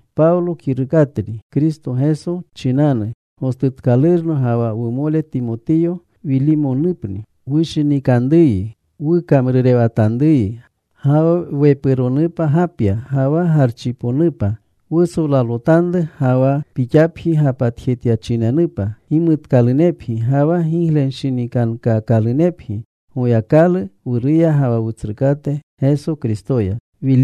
Pawlo kirukatni, Kristo Geso chinanu gostutkalurno, ga wa wumole Timotiyo. Wilimonupni wushinikanruyi wukamrurewatanruyi. Ga wa wepuronupa Gapya, ga wa Garchiponupa wusolalotanru, ga wa pixapji gapatjetyachinenupa. Gimutkalunepgi ga wa giglewanshinikankaakalunepgi Goyakalu Wuruya ga wa Wutsrukate Geso Kristoya.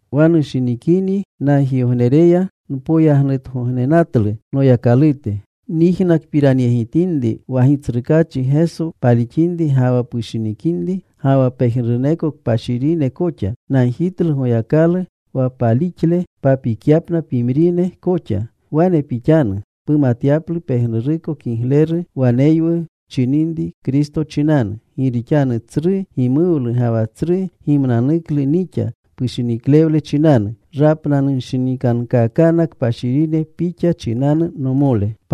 Wa nushinikinyi nagjigognereya npoyagnutgognenatlu Noyakalute, nyijnakpiranyegitinri wa Gitsrukaachi Geso palixinri ga wa pushinikinri, ga wa pejnuruneko kpashirine koxa. Nagjitlu Goyakalu wa palixle papikyapna pimrine koxa. Wane pixanu pumatyaplu pejnuruko kigleru waneywu wchininri Kristo chinanu. Gi rixanu tsru gimuwlu ga wa tsru gimnanuklu nixa pushiniklewle chinanu. Rapnanunshinikankaakana kpashirine pixa chinanu, nomole.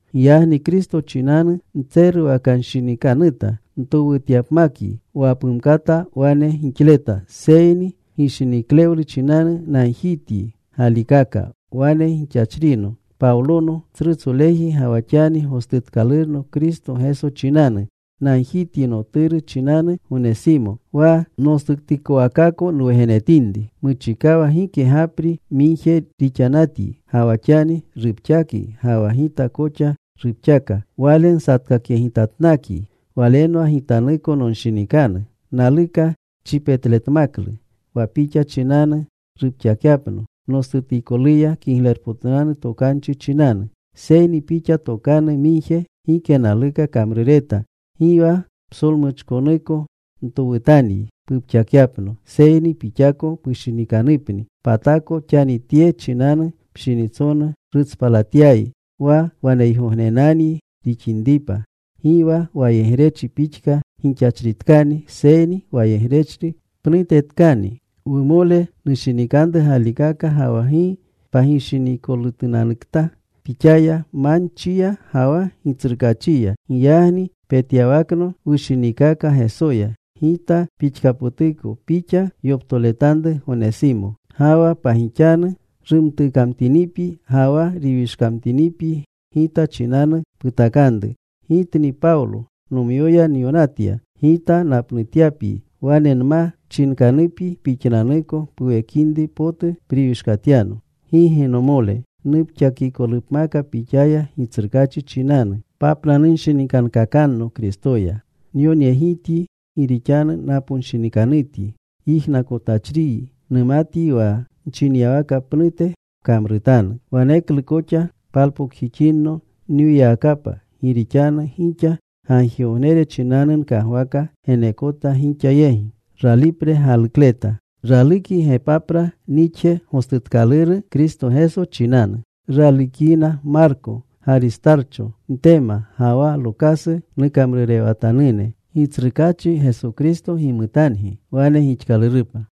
Giyagni Kristo chinanu ntseruwanshinikanuta ntowutyapmakyi wa pumkata wane gixleta. Seyni gishiniklewlu chinanu nagjityi galikaka. Wane gixachrino Pawlono, tsrutsoleji, ga wa xani gostutkalurno Kristo Geso chinanu. Nagjityi noturu chinanu, Gonesimo, wa nostutikowakako nwugenetinri. Muchikawa gike gapri migje rixanatyi. Ga wa xani rupxakyi ga wa gita koxa rupxaka. Wale nsatkakyegitatnakyi. Walenwa gitanuko nonshinikanu. Naluka chipetletmaklu, wa pixa chinanu rupxakyapno nostutikoluya Kiglerpotunanu Tokanchi chinanu. Seyni pixa tokanu migje gike naluka kamrureta. Gi wa psolmuchkonuko ntowutanyi, pupxakyapno, seyni pixako pushinikanupni. Patako xani tye chinanu pshinitsonu rutspalatyayi, wa waneygognenanyi rixinripa. Gi wa wayegrechri pixka gixachritkani, seyni wayegrechri pnutetkani, wumole nushinikanru galikaka, ga wa gi pagishiniikolutunanukta pixaya manchiya ga wa Gitsrukaachiya. Giyagni petyawakno wushiniikaka Gesoya, gita pixkapotuko pixa yoptoletanru, Gonesimo. Ga wa pagixanu rumtukamtinipyi ga wa riwishkamtinipyi gita chinanu putakanru. Gitni Pawlo nomyoya nyonatya, Gita gapnutyapyi. Wane nma chinkanupyi pixnanuko puwekinri potu priwishkatyano. Gigi, nomole. Nupxakikolupmaka pixaya Gitsrukaachi chinanu. Papnanunshinikankakanno Kristoya. Nyonyegityi gi rixanu naponshinikanutyi yijnakotachriyi. Numatlu wa nchinyawaka pnute pkamrutanu. Waneklu koxa palpokjixinno nwiyawakapa. Gi rixanu gixa gagjigognere chinanu nkagwaka geneekota gixa yegi. Ralukyi Gepapra nixje gostutkaluru Kristo Geso chinanu. Ralukyina Marko, Garistarcho, Ntema, ga wa Lokasu, nukamrurewatanune. Gitsrukaachi Geso Kristo gimutangi. Wane gixkalurupa.